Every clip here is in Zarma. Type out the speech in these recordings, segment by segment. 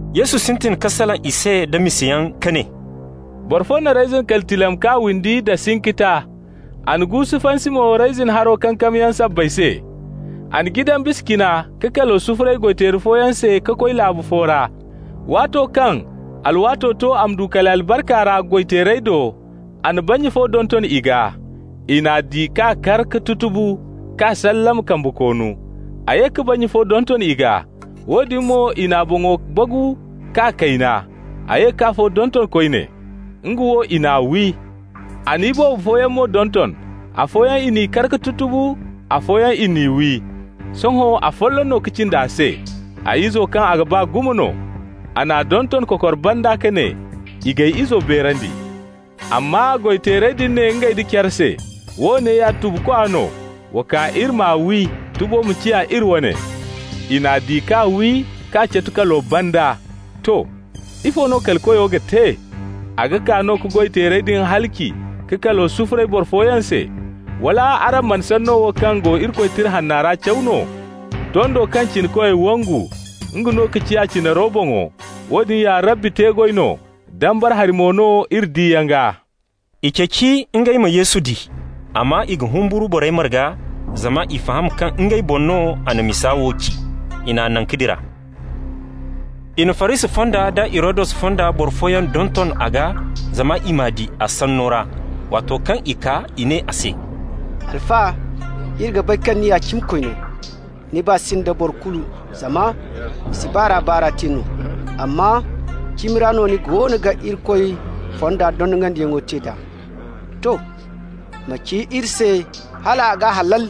Yesu sintin ka salaŋ i se da misayaŋ ka ne: «Boro fo na reyzin kali tilam k'a windi da sinkita, a na guusu fansi mo reyzin haro kankamyaŋ sabbay se. A na jidan bisa cina ka kalo sufuray goy-teeri fooyaŋ se ka koy laabu fo ra. Waato kaŋ alwaato to a ma du kali albarka ra goy-teerey do, a na bannya fo donton i gaa. I n'a di k'a kar ka tutubu k'a sallama kambe koonu. A ye ka bannya fo donton i gaa. Woodin mo i n'a boŋo bagu k'a kayna. A ye k'afo donton koyne. Nga wo i n'a wi. A na iboobo fooyaŋ mo donton. Afooyaŋ i n'i kar ka tutubu, afooyaŋ i n'i wi. Sohõ afolloŋ no ka cindi a se, a izo kaŋ a ga ba gumo no. A n'a donton kokor banda ka ne: ‹I g'ay izo beerandi.› Amma goy-teerey din ne ngey nda care se: ‹Woone ya tubukwa no. Wa kaa, iri m'a wi, tubo ma ciya iri wane.› I n'a di k'a wi k'a catu kalo banda. To. Ifo no kali koyo ga te? A ga kaa no ka goy-teerey din halaci ka kalo sufuray boro fooyaŋ se. Wala araŋ mana sanno wo kaŋ go Irikoy Tira Hanna ra caw no? ‹Tondo kaŋ cinakoy wangu, nga no ciya cinaro boŋo. Woodin ya Rabbi te-goy no, dambara hari mo no iri diyaŋ gaa.›» I ceeci ngey ma Yesu di, amma i ga humburu borey marga, zama i faham kaŋ ngey boŋ no a na misa wo ci. I n'a naŋ ka dira. I na Farisi fonda da Hirodus fonda boro fooyaŋ donton a gaa zama i m'a di a sanno ra. Waato kaŋ i kaa, i ne a se: «Alfa, iri ga bay kaŋ ni ya cimikoy no, ni baa si nda boro kulu zama ni si baar'a-baar'a te no, amma cimi ra no ni goono ga Irikoy fonda dondonandiyaŋo te nd'a. To, ma ci iri se hala a ga halal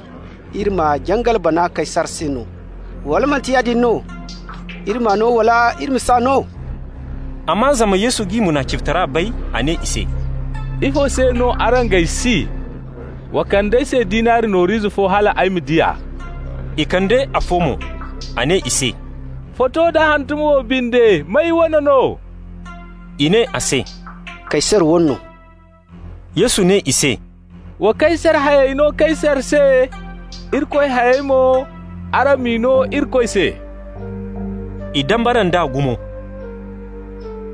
iri ma jangal bana Kaysar se no, wala manti yaadin no? Iri m'a no wala iri ma si no?» Amma zama Yesu g'i munaficitara bay, a ne i se: «Ifo se no araŋ g'ay si? Wa kand'ay se dinari nooru ize fo hal ay ma di a.» I kande afo mo. A ne i se: «Foto da hantumo wo binde, may wane no?» I ne a se: «Kaysar wane no.» Yesu ne i se: «Wa Kaysar hayey no Kaysar se. Irikoy hayey mo, araŋ m'i no Irikoy se.» I dambara nd'a gumo.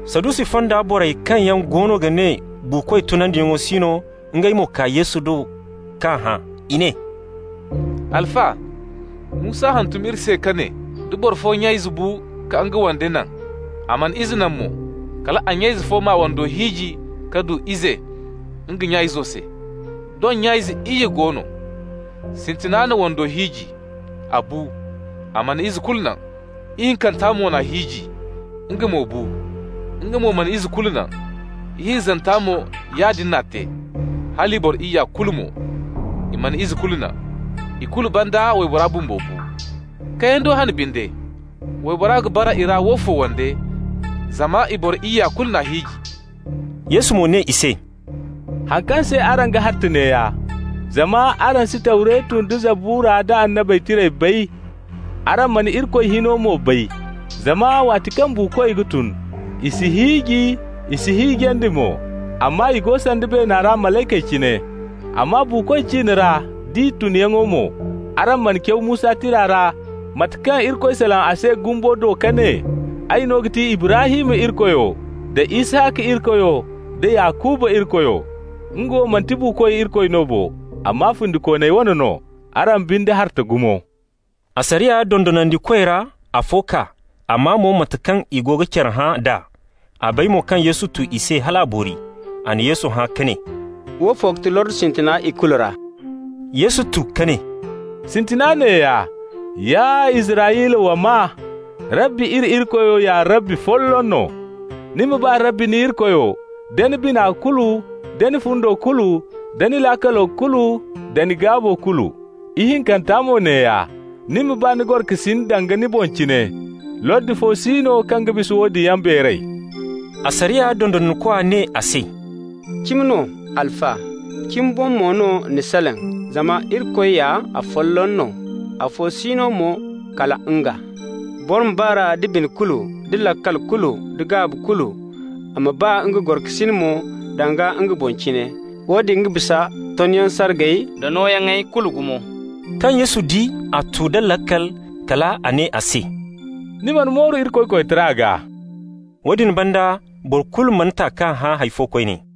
Sadusi fonda borey kaŋ yaŋ goono ga ne buukoy tunandiyaŋ si no, ngey mo kaa Yesu do k'a hã. I ne: «Alfa, Musa hantum iri se ka ne, da boro fo nya ize bu ka nga wande naŋ, a mana ize naŋ mo, kal a nya ize fo m'a wando hiiji ka du ize nga nya izo se. Doŋ nya ize iyye go no. Sintina na wando hiiji. A bu, a mana ize kulu naŋ. Ihinkanta mo n'a hiiji. Nga mo bu, nga mo mana ize kulu naŋ. Ihinzanta mo, yaadin n'a te, hala i boro iyya kulu mo, i mana ize kulu naŋ. I kulu banda waybora bumbo bu. Kayando hane binde, waybora ga bara i ra woofo wande, zama i boro iyya kulu n'a hiiji?» Yesu mo ne i se: «Haŋ kaŋ se araŋ ga harta neeya: zama araŋ si Tawretu nda Zabura nda Annabey Tirey bay, araŋ mana Irikoy hino mo bay. Zama waati kaŋ buukoy ga tun, i si hiiji, i s'i hiijandi mo, amma i go sanda beena ra malaykey cine. Amma buukoy ciine ra d'i tunyaŋo mo, araŋ mana caw Musa tira ra, mate kaŋ Irikoy salaŋ a se gumbo do ka ne: ‹Ay no ga ti Ibrahim Irikoyo, da Isaka Irikoyo, da Yakuba Irikoyo.› Nga wo manti buukoy Irikoy no bo, amma fundikooney wane no. Araŋ binde harta gumo.» Asariya dondonandikoy ra afo kaa, a maa mo mate kaŋ i go ga care hã d'a. A bay mo kaŋ Yesu tu i se hal a boori. A na Yesu hã ka ne: «Woofo ga ti lordi sintina i kulu ra.» Yesu tu ka ne: «Sintina neeya: ‹Ya Israyla, wa maa! Rabbi iri Irikoyo, ya Rabbi folloŋ no. Ni ma ba Rabbi ni Irikoyo da ni bina kulu, da ni fundo kulu, da ni laakalo kulu, da ni gaabo kulu.› Ihinkanta mo neeya: ‹Ni ma ba ni gorokasin danga ni boŋ cine.› Lordi fo si no kaŋ ga bisa woodin yaŋ beeray.» Asariya dondonandikwa ne a se: «Cimi no, Alfa, cimi boŋ mo no ni salaŋ. Zama Irikoy ya afolloŋ no, afo si no mo kala nga. Boro ma ba r'a da bine kulu da laakal kulu da gaabi kulu, a ma ba nga gorokasin mo danga nga boŋ cine, woodin ga bisa tonyaŋ sargay da nooyaŋey kulu gumo.» Kaŋ Yesu di a tu da laakal, kal a ne a se: «Ni mana mooru Irikoy koytara gaa.» Woodin banda boro kulu mana ta k'a hã hay fo koyne.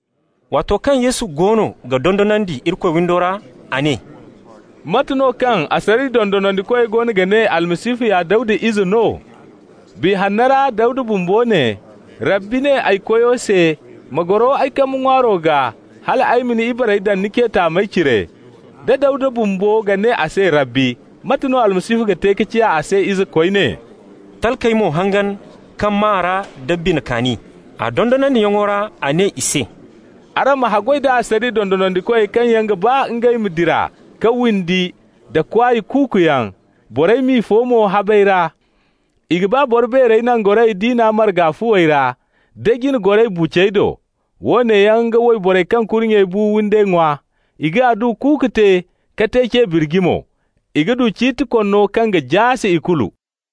Waato kaŋ Yesu goono ga dondonandi Irikoy windo ra, a ne: «Mate no kaŋ asariya dondonandikoy goono ga ne Almasihu ya Dawda ize no? Biya Hanna ra Dawda bumbo ne: ‹Rabbi ne ay Koyo se: Ma goro ay kambe ŋwaaro gaa, hal ay ma ni ibarey daŋ ni ce taamey cire.› Da Dawda bumbo ga ne a se Rabbi, mate no Almasihu ga te ka ciya a se ize koyne?» Talkey mo hangan ka maa r'a da bina kaani. A dondonandiyaŋo ra a ne i se: «Araŋ ma haggoy da asariya dondonandikoy kaŋ yaŋ ga ba ngey ma dira ka windi nda kwaay kuuku yaŋ, borey m'i fo mo habey ra. I ga ba boro beerey nangorayey diina marga fuwey ra, da jine goray bucey do. Woone yaŋ ga wayborey kaŋ kurnyey bu windey ŋwa, i ga adduwa kuuku te ka te ce birji mo. I ga du ciiti konno kaŋ ga jaase ikulu.»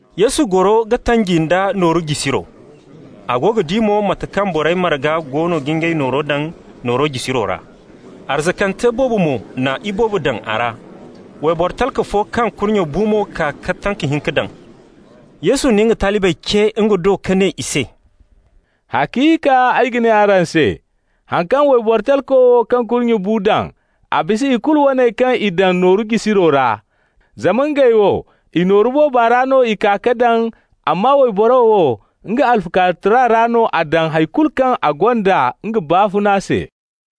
Yesu goro ga tanji nda nooru jisiro. A go ga di mo mate kaŋ borey marga goono ga ngey noorey daŋ nooru jisiro ra. Arzakante boobo mo na iboobo daŋ a ra. Wayboro talka fo kaŋ kurnye bu mo kaa ka tanka hinka daŋ. Yesu na nga talibey ce nga do ka ne i se: «Haciika ay ga ne araŋ se: haŋ kaŋ wayboro talko wo kaŋ kurnye bu daŋ, a bisa i kulu waney kaŋ i daŋ nooru jisiro ra. Zama ngey wo, i nooru booba ra no i kaa ka daŋ, amma wayboro wo, nga alfukaarutara ra no a daŋ hay kulu kaŋ a gonda nga baafuna se.»